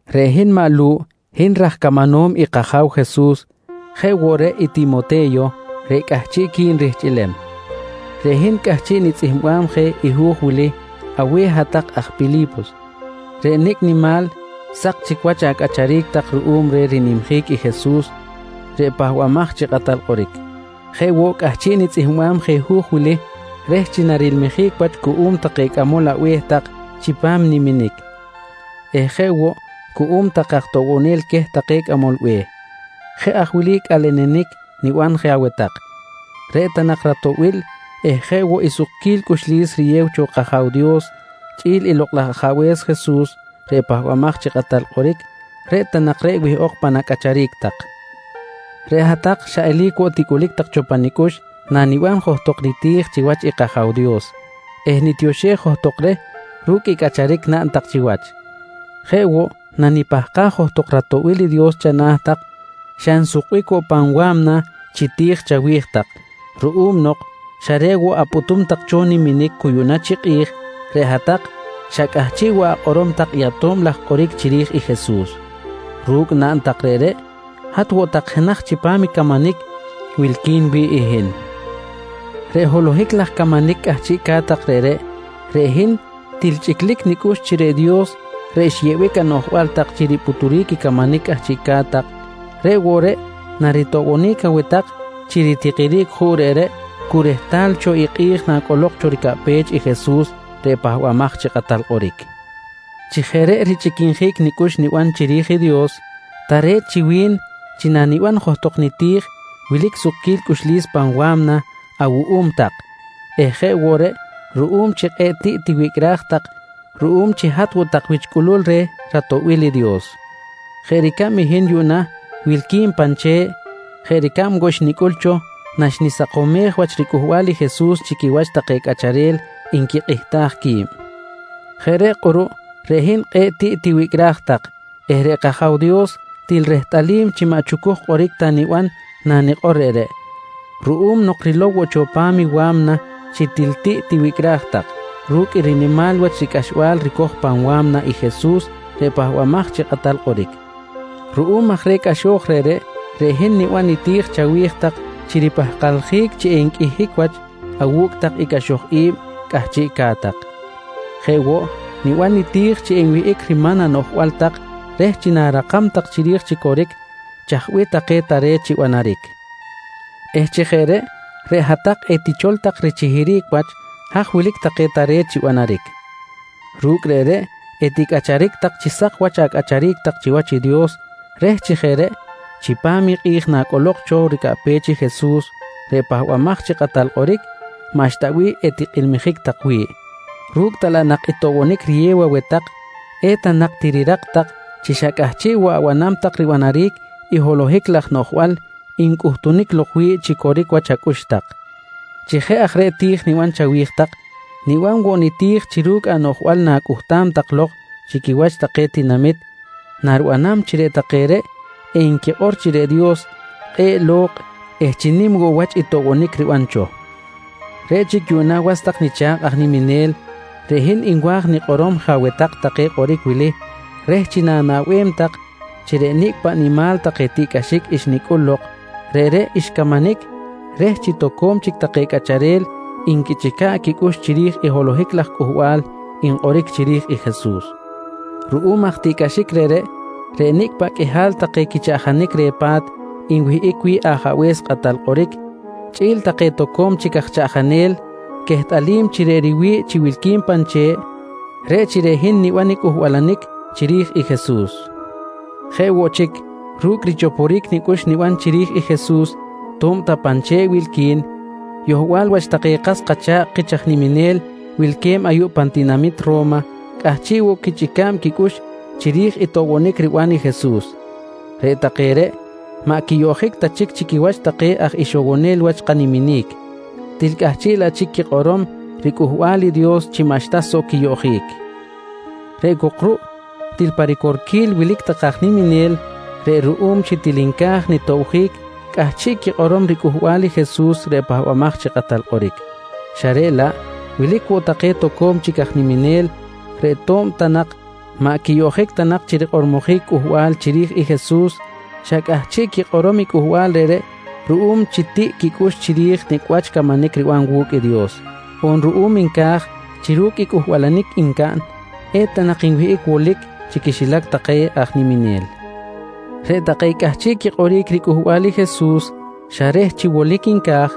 Reꞌ hin maꞌ Lu̱ꞌ, hin raj camanom i kAja̱w Jesus jeꞌ woꞌ reꞌ i Timote̱yo reꞌ cꞌahchiꞌqui̱n rihchꞌilem. Reꞌ hin cꞌahchiꞌ nitzꞌihmbam je i hu̱j wili aweh hat-tak aj Pili̱pos reꞌ nicꞌ nimal sak chic wach acꞌacharic tak ruꞌum reh rinimjic i Jesus reꞌ Pahbamaj chi Kꞌatal Kꞌoric. Jeꞌ woꞌ, cꞌahchiꞌ nitzꞌihmbam je hu̱j wili reh chi narilmijic wach cuꞌum take cꞌamol abe̱h tak chipam niminic eh jeꞌ woꞌ cuꞌum take aj toꞌbonel queh take cꞌamol be̱h. Jeꞌ aj wili cꞌalenenic niban je aweh tak: Reꞌ ta nak ratoꞌbil eh jeꞌ woꞌ i sukquil cꞌuxlis riyew cho kAja̱w Dios chꞌi̱l i Lokꞌ laj Ajabe̱s Jesus reꞌ Pahbamaj chi Kꞌatal Kꞌoric, reꞌ ta nak reꞌ wihꞌok pan acꞌacharic tak. Reꞌ hat-tak xa eli̱c woꞌ ticꞌulic tak cho pa nicꞌux naniban johtok niti̱j chiwach i kAja̱w Dios eh nitioxej johtok reh ru̱cꞌ i cꞌacharic naꞌn tak chiwach. Jeꞌ woꞌ, nanipahkaj johtok ratoꞌbil i Dios chana̱ tak, xa nsukbic woꞌ pan wa̱mna chi ti̱j chawi̱j tak ruꞌum nok xa reꞌ woꞌ apꞌutum tak cho niminic cu yuꞌna chi kꞌi̱j, reꞌ hat-tak xa cꞌahchiꞌ woꞌ akꞌorom tak i ato̱b laj kꞌoric chiri̱j i Jesus. Ru̱cꞌ naꞌn tak reꞌreꞌ, hat woꞌ tak jenaj chipam i camanic wilqui̱n wi̱ꞌ i hin. Reꞌ holohic laj camanic cꞌahchiꞌca̱t tak reꞌreꞌ, reꞌ hin til chꞌiclic nicꞌux chi reꞌ Dios reꞌ xyeꞌbic anoꞌjbal tak chi ripꞌuturic i camanic cꞌahchiꞌca̱t tak, reꞌ woꞌ reꞌ naritoꞌbonic aweh tak chi ritikiric juꞌ reꞌreꞌ cu rehtal cho i kꞌi̱j nacꞌolok cho ricaꞌpech i Jesus reꞌ Pahbamaj chi Kꞌatal Kꞌoric. Chi jeꞌ reꞌ richꞌiquinjic nicꞌux niban chiri̱j i Dios, tare̱t chi wi̱n chi naniban johtok niti̱j wilic sukquil cꞌuxlis pan wa̱mna awuꞌum tak eh jeꞌ woꞌ reꞌ, ruꞌum chi kꞌe̱ꞌ tiꞌ tiwicꞌraj tak ruꞌum chi hat woꞌ tak wich cꞌulul reh ratoꞌbil i Dios. Jeꞌ ricab i hin yuꞌna wilqui̱n pan che̱ꞌ jeꞌ ricab woꞌ xnicꞌul cho naxnisakomej wach ricꞌuhbal i Jesus chi quiwach take cꞌacharel nquikꞌihtaj qui̱b. Jeꞌ reꞌ kꞌuruꞌ reꞌ hin kꞌe̱ꞌ tiꞌ tiwicꞌraj tak eh reꞌ kAja̱w Dios til rehtꞌalim chi maꞌ chucuj kꞌoric ta niban nanikꞌor reꞌreꞌ, ruꞌum nok rilow woꞌ cho pan i wa̱mna chi til tiꞌ tiwicꞌraj tak ru̱cꞌ i rinimal ricꞌaxbal ricoj pan wa̱mna i Jesus reꞌ Pahbamaj chi Kꞌatal Kꞌoric. Ruꞌum aj reh cꞌaxo̱j reꞌreꞌ, reꞌ hin niban niti̱j chawi̱j tak chi ripahkaljic chi enqꞌuihic wach awu̱cꞌ tak i cꞌaxoj i̱b cꞌahchiꞌca̱t tak. Jeꞌ woꞌ niban niti̱j chi enwihꞌic riman anoꞌjbal tak reh chi na̱rakam tak chiri̱j chi coric chaj bih take tare̱t chi banaric eh chi jeꞌ reꞌ, reꞌ hat-tak etichol tak richihiric wach haj wilic take tare̱t chi banaric. Ru̱cꞌ reꞌreꞌ eticꞌacharic tak chi sak wach acꞌacharic tak chiwach i Dios reh chi jeꞌ reꞌ chipam i kꞌi̱j nacꞌolok cho ricaꞌpech i Jesus reꞌ Pahbamaj chi Kꞌatal Kꞌoric, maꞌxta bih etikꞌilmijic tak wi̱ꞌ, ru̱cꞌ ta laꞌ nak i toꞌbonic riyew aweh tak, eta nak tirirak tak chi xa cꞌahchiꞌ woꞌ abanam tak ribanaric i holohic laj noꞌjbal ncꞌuhtunic lok wi̱ꞌ chi coric wach acꞌux tak. Chi jeꞌ aj reꞌ ti̱j niban chawi̱j tak, niban woꞌ niti̱j chi ru̱cꞌ anoꞌjbal na̱cꞌuhtam tak lok chi quiwach take tinamit naribanam chi reꞌ take reꞌ enquikꞌor chi reꞌ Dios kꞌe̱ꞌ lo̱kꞌ eh chi nim woꞌ wach i toꞌbonic riban cho. Reꞌ chic yuꞌna was tak nicha̱kꞌ aj niminel, reꞌ hin nwa̱j nikꞌorom je aweh tak take kꞌoric wili reh chi na̱naꞌbem tak chi reꞌ nicꞌ paꞌ nimal take tiꞌcꞌaxic xnicꞌul lok, reꞌreꞌ xcamanic reh chi toco̱m chic take cꞌacharel nquichꞌica̱ꞌ quicꞌux chiri̱j i holohic laj cꞌuhbal nkꞌoric chiri̱j i Jesus. Ruꞌum aj tiꞌcꞌaxic reꞌreꞌ, reꞌ nicꞌ paꞌ qꞌuihal take quichaꞌjanic reh pa̱t nwihꞌic wi̱ꞌ ajabe̱s kꞌatal kꞌoric, chꞌi̱l take toco̱m chic aj chaꞌjanel quehtꞌalim chi reꞌ riwi̱ꞌ chi wilqui̱n pan che̱ꞌ, reꞌ chi reꞌ hin niban i cꞌuhbalanic chiri̱j Jesus. Jeꞌ woꞌ chic, ru̱cꞌ richoporic nicꞌux niban chiri̱j i Jesus to̱b ta pan che̱ꞌ wilqui̱n, yohbal wach take kas kacha̱kꞌ kich aj niminel wilque̱b ayuꞌ pan tinamit Ro̱ma cꞌahchiꞌ woꞌ quichꞌica̱b quicꞌux chiri̱j i toꞌbonic riban i Jesus. Reꞌ take reꞌreꞌ, maꞌ quiyoꞌjic ta chic chi quiwach take aj ixowonel wach kaniminic, til cꞌahchiꞌ laꞌ chic quikꞌorom riCꞌuhbal i Dios chi maꞌxta soꞌ quiyoꞌjic. Reꞌ cok ruꞌ til pa ricorquil wilic take aj niminel reꞌ ruꞌum chi til nca̱j nitobjic cꞌahchiꞌ quikꞌorom ricꞌuhbal i Jesus reꞌ Pahbamaj chi Kꞌatal Kꞌoric, xa reꞌ laꞌ wilic woꞌ take toco̱m chic aj niminel reꞌ to̱b ta nak maꞌ quiyoꞌjic ta chi rikꞌormojic cꞌuhbal chiri̱j i Jesus, xa cꞌahchiꞌ quikꞌorom i cꞌuhbal reꞌreꞌ ruꞌum chi tiꞌ quicꞌux chiri̱j nicꞌ wach camanic riban wu̱cꞌ i Dios, on ruꞌum nca̱j chi ru̱cꞌ i cꞌuhbalanic ncaꞌn, eta nak nwihꞌic wolic chi quixilac take aj niminel. Reꞌ take cꞌahchiꞌ quikꞌoric ricꞌuhbal i Jesus xa reh chi wolic nca̱j,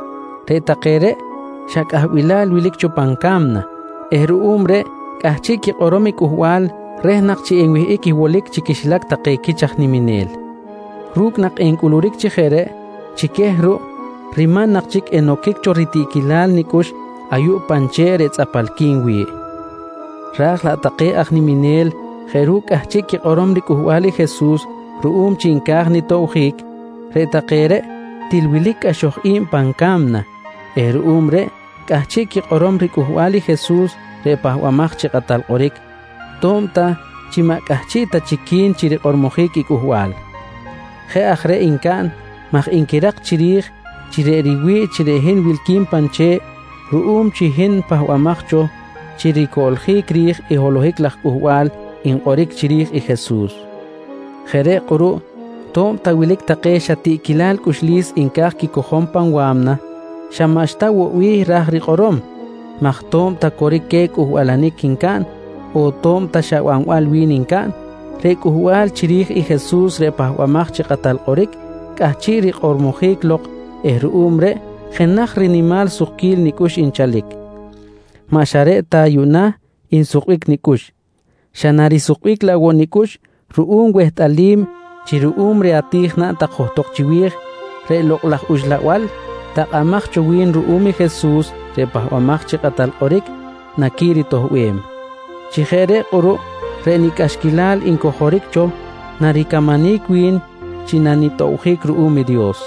reꞌ take reꞌ xa cꞌahbilal wilic cho pan ca̱mna eh ruꞌum reꞌ cꞌahchiꞌ quikꞌorom i cꞌuhbal reh nak chi enwihꞌic i wolic chi quixilac take quich aj niminel. Ru̱cꞌ nak encꞌuluric chi jeꞌ reꞌ, chi queh ruꞌ riman nak chic enoquic cho ritiꞌquilal nicꞌux ayuꞌ pan che̱ꞌ reꞌ tzꞌapalqui̱n wi̱ꞌ. Raj laꞌ take aj niminel jeꞌ ru̱cꞌ cꞌahchiꞌ quikꞌorom ricꞌuhbal i Jesus ruꞌum chi nca̱j nitobjic, reꞌ take reꞌ til wilic cꞌaxoj i̱b pan ca̱mna eh ruꞌum reꞌ cꞌahchiꞌ quikꞌorom ricꞌuhbal i Jesus reꞌ Pahbamaj chi Kꞌatal Kꞌoric to̱b ta chi maꞌ cꞌahchiꞌ ta chic qui̱n chi rikꞌormojic i cꞌuhbal. Jeꞌ aj reꞌ ncaꞌn maj nquirak chiri̱j chi reꞌ riwi̱ꞌ chi reꞌ hin wilqui̱n pan che̱ꞌ ruꞌum chi hin pahbamaj cho chi ricoꞌljic ri̱j i holohic laj cꞌuhbal nkꞌoric chiri̱j i Jesus. Jeꞌ reꞌ kꞌuruꞌ to̱b ta wilic take xa tiꞌquilal cꞌuxlis nca̱j quicojom pan wa̱mna, xa maꞌxta woꞌ bih ra̱j rikꞌorom maj to̱b ta coric queh cꞌuhbalanic ncaꞌn on to̱b ta xa banbal wi̱n ncaꞌn, reꞌ cꞌuhbal chiri̱j i Jesus reꞌ Pahbamaj chi Kꞌatal Kꞌoric cꞌahchiꞌ rikꞌormojic lok eh ruꞌum reꞌ jenaj rinimal risukquil nicꞌux nchalic. Maꞌ xa reꞌ ta yuꞌna nsukbic nicꞌux, xa narisukbic laꞌ woꞌ nicꞌux ruꞌum wehtꞌalim chi ruꞌum reh ati̱j naꞌn tak johtok chiwi̱j, reꞌ Lokꞌ laj Uxlabal takꞌamaj cho wi̱n ruꞌum i Jesus reꞌ Pahbamaj chi Kꞌatal Kꞌoric, naquiritoꞌbem. Chi jeꞌ reꞌ kꞌuruꞌ reꞌ nicꞌaxquilal ncojoric cho naricamanic wi̱n chi nanitobjic ruꞌum i Dios.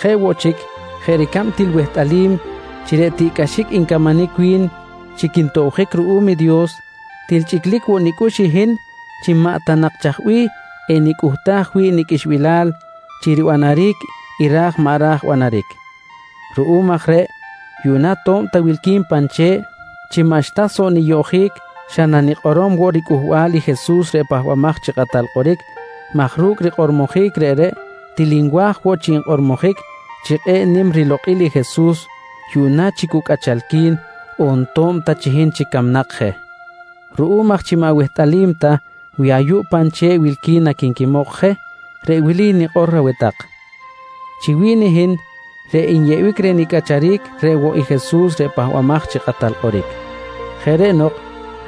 Jeꞌ woꞌ chic, jeꞌ ricab til wehtꞌalim chi reꞌ tiꞌcꞌaxic ncamanic wi̱n chi quintobjic ruꞌum i Dios, til chꞌiclic woꞌ nicꞌux i hin chi maꞌ ta nak chaj bih enicꞌuhtaj wi̱ꞌ niqꞌuixbilal chi ribanaric i ra̱j maꞌ ra̱j banaric. Ruꞌum aj reꞌ yuꞌna to̱b ta wilqui̱n pan che̱ꞌ, chi maꞌxta soꞌ niyoꞌjic xa nanikꞌorom woꞌ ricꞌuhbal i Jesus reꞌ Pahbamaj chi Kꞌatal Kꞌoric maj ru̱cꞌ rikꞌormojic reꞌreꞌ, til nwa̱j woꞌ chi nkꞌormojic chi kꞌe̱ꞌ nim i rilokꞌil i Jesus yuꞌna chi cu cꞌachalqui̱n on to̱b ta chi hin chic camnak je. Ruꞌum aj chi maꞌ wehtꞌalim ta wi ayuꞌ pan che̱ꞌ wilqui̱n naquinquimok je, reꞌ wili nikꞌor aweh tak: Chi wi̱n hin, reꞌ nyeꞌbic reh nicꞌacharic reꞌ woꞌ i Jesus reꞌ Pahbamaj chi Kꞌatal Kꞌoric. Jeꞌ reꞌ nok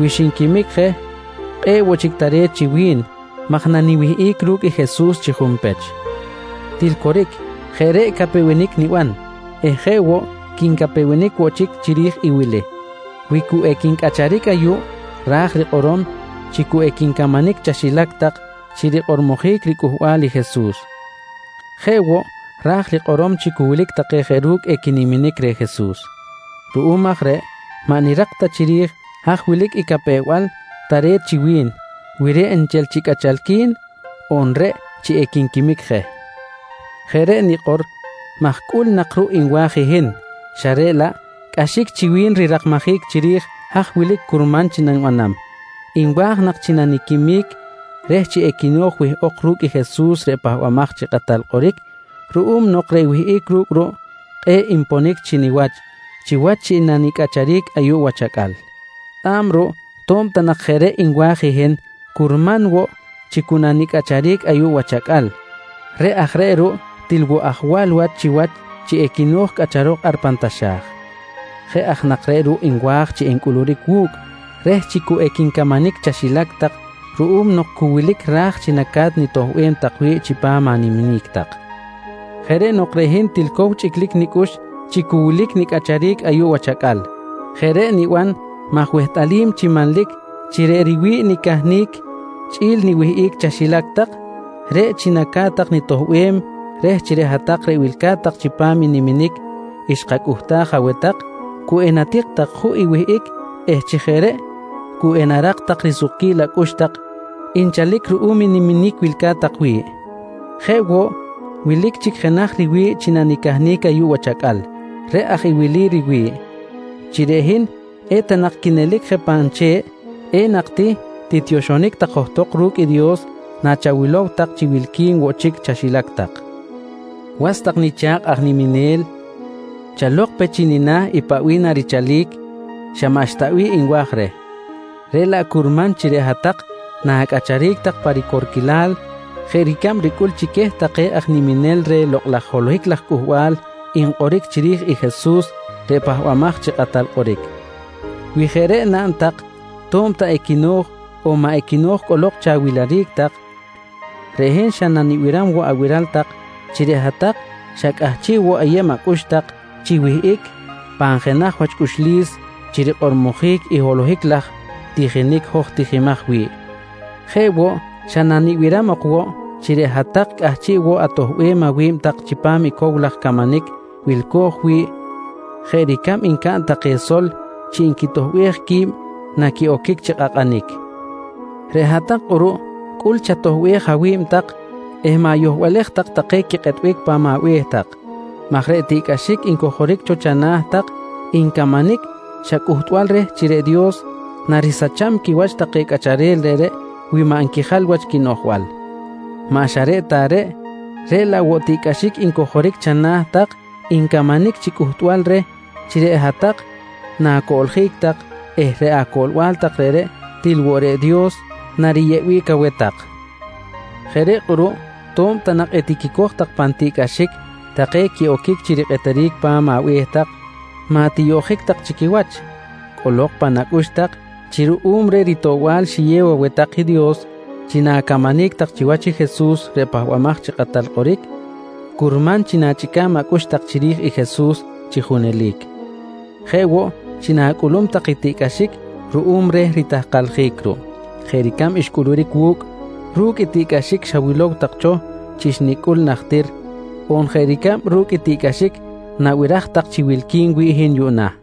wi xinquimic je, kꞌe̱ꞌ woꞌ chic tare̱t chi wi̱n maj naniwihꞌic ru̱cꞌ i Jesus chi junpech. Til coric, jeꞌ reꞌ capewenic niban eh jeꞌ woꞌ quincapewenic woꞌ chic chiri̱j i wili: Wi cu equincꞌacharic ayuꞌ ra̱j rikꞌorom chi cu equincamanic chaxilac tak chi rikꞌormojic ricꞌuhbal i Jesus. Jeꞌ woꞌ, raj rikꞌorom chi cu wilic take jeꞌ ru̱cꞌ equiniminic reh Jesus. Ruꞌum aj reꞌ maꞌ nirak ta chiri̱j haj wilic i capew-bal tare̱t chi wi̱n, wi reꞌ nchel chi cꞌachalqui̱n on reꞌ chi equinquimic je. Jeꞌ reꞌ nikꞌor maj cꞌul nak ruꞌ nwa̱j i hin xa reꞌ laꞌ cꞌaxic chi wi̱n rirakmajic chiri̱j haj wilic curman chi nanibanam. Nwa̱j nak chi naniquimic reh chi equino̱j wihꞌok ru̱cꞌ i Jesus reꞌ Pahbamaj chi Kꞌatal Kꞌoric ruꞌum nok reꞌ wihꞌic ru̱cꞌ ruꞌ, kꞌe̱ꞌ nponic chi niwach chiwach chi nanicꞌacharic ayuꞌ wach acꞌal. Tzꞌa̱b ruꞌ to̱b ta nak jeꞌ reꞌ nwa̱j i hin, curman woꞌ chi cu nanicꞌacharic ayuꞌ wach acꞌal. Reꞌ aj reꞌ ruꞌ til woꞌ ajwal wach chiwach chi equino̱j cꞌacharok ar pan taxa̱j. Jeꞌ aj nak reꞌ ruꞌ nwa̱j chi encꞌuluric wu̱cꞌ reh chi cu equincamanic chaxilac tak ruꞌum nok cu wilic ra̱j chi naca̱t nitoꞌbem tak wi̱ꞌ chipam animinic tak. Jeꞌ reꞌ nok reꞌ hin til cow chꞌiclic nicꞌux chi cu wilic nicꞌacharic ayuꞌ wach acꞌal. Jeꞌ reꞌ niban maj wehtꞌalim chi manlic chi reꞌ riwi̱ꞌ nicahnic chꞌi̱l niwihꞌic chaxilac tak, reꞌ chi naca̱t tak nitoꞌbem reh chi reꞌ hat-tak reꞌ wilca̱t tak chipam i niminic xkacꞌuhtaj aweh tak cu enatik tak juꞌ i wihꞌic eh chi jeꞌ reꞌ cu enarak tak risukquil acꞌux tak nchalic ruꞌum i niminic wilca̱t tak wi̱ꞌ. Jeꞌ woꞌ wilic woꞌ chic jenaj riwi̱ꞌ chi nanicahnic ayuꞌ wach acꞌal, reꞌ aj i wili riwi̱ꞌ: Chi reꞌ hin eta nak quinelic je pan che̱ꞌ, enak ti tiyoxonic tak johtok ru̱cꞌ i Dios nachawilow tak chi wilqui̱n woꞌ chic chaxilac tak. Was tak nicha̱kꞌ aj niminel, chalok pe chi nina̱ paꞌ bih narichalic, xa maꞌxta bih nwa̱j reh, reꞌ laꞌ curman chi reꞌ hat-tak na̱cꞌacharic tak pa ricorquilal jeꞌ ricab ricꞌul chi queh take aj niminel reh lokꞌ laj holohic laj cꞌuhbal nkꞌoric chiri̱j i Jesus reꞌ Pahbamaj chi Kꞌatal Kꞌoric. Wi jeꞌ reꞌ naꞌn tak to̱b ta equino̱j on maꞌ equino̱j cꞌolok chi awiliric tak, reꞌ hin xa nanibiram woꞌ abiral tak chi reꞌ hat-tak xa cꞌahchiꞌ woꞌ ayeb acꞌux tak chi wihꞌic pan jenaj wach cꞌuxlis chi rikꞌormojic i holohic laj tijinic hoj tijimaj wi̱ꞌ. Jeꞌ woꞌ, xa nanibiram ok woꞌ chi reꞌ hat-tak cꞌahchiꞌ woꞌ atoꞌbem awi̱b tak chipam i cow laj camanic wilco̱j wi̱ꞌ jeꞌ ricab ncaꞌn take sol chi nquitoꞌbej qui̱b naquiꞌoquic chi kꞌakꞌanic. Reꞌ hat-tak kꞌuruꞌ cꞌul chatoꞌbej awi̱b tak eh ma̱yohbalej tak take quikꞌetbic pa̱m abe̱h tak maj reꞌ tiꞌcꞌaxic ncojoric cho chana̱ tak ncamanic xa cꞌuhtbal reh chi reꞌ Dios narisacham quiwach take cꞌacharel reꞌreꞌ wi maꞌ nquijal wach quinoꞌjbal. Maꞌ xa reꞌ ta reꞌ, reꞌ laꞌ woꞌ tiꞌcꞌaxic ncojoric chana̱ tak ncamanic chi cꞌuhtbal reh chi reꞌ hat-tak na̱coꞌljic tak eh reꞌ acoꞌlbal tak reꞌreꞌ til woꞌ reꞌ Dios nariyeꞌbic aweh tak. Jeꞌ reꞌ kꞌuruꞌ to̱b ta nak etiquicoj tak pan tiꞌcꞌaxic take quiꞌoquic chi rikꞌeteric pan abe̱h tak, maꞌ tiyoꞌjic tak chi quiwach. Cꞌolok pan acꞌux tak chi ruꞌum reh ritoꞌbal xiyew aweh tak i Dios chi na̱camanic tak chiwach i Jesus reꞌ Pahbamaj chi Kꞌatal Kꞌoric, curman chi na̱chꞌica̱b acꞌux tak chiri̱j i Jesus chi junelic, jeꞌ woꞌ chi na̱cꞌulum tak i tiꞌcꞌaxic ruꞌum reh ritahkaljic ruꞌ jeꞌ ricab xcꞌuluric wu̱cꞌ ru̱cꞌ i tiꞌcꞌaxic xawilow tak cho chi xnicꞌul najtir on jeꞌ ricab ru̱cꞌ i tiꞌcꞌaxic nabiraj tak chi wilqui̱n wi̱ꞌ hin yuꞌna.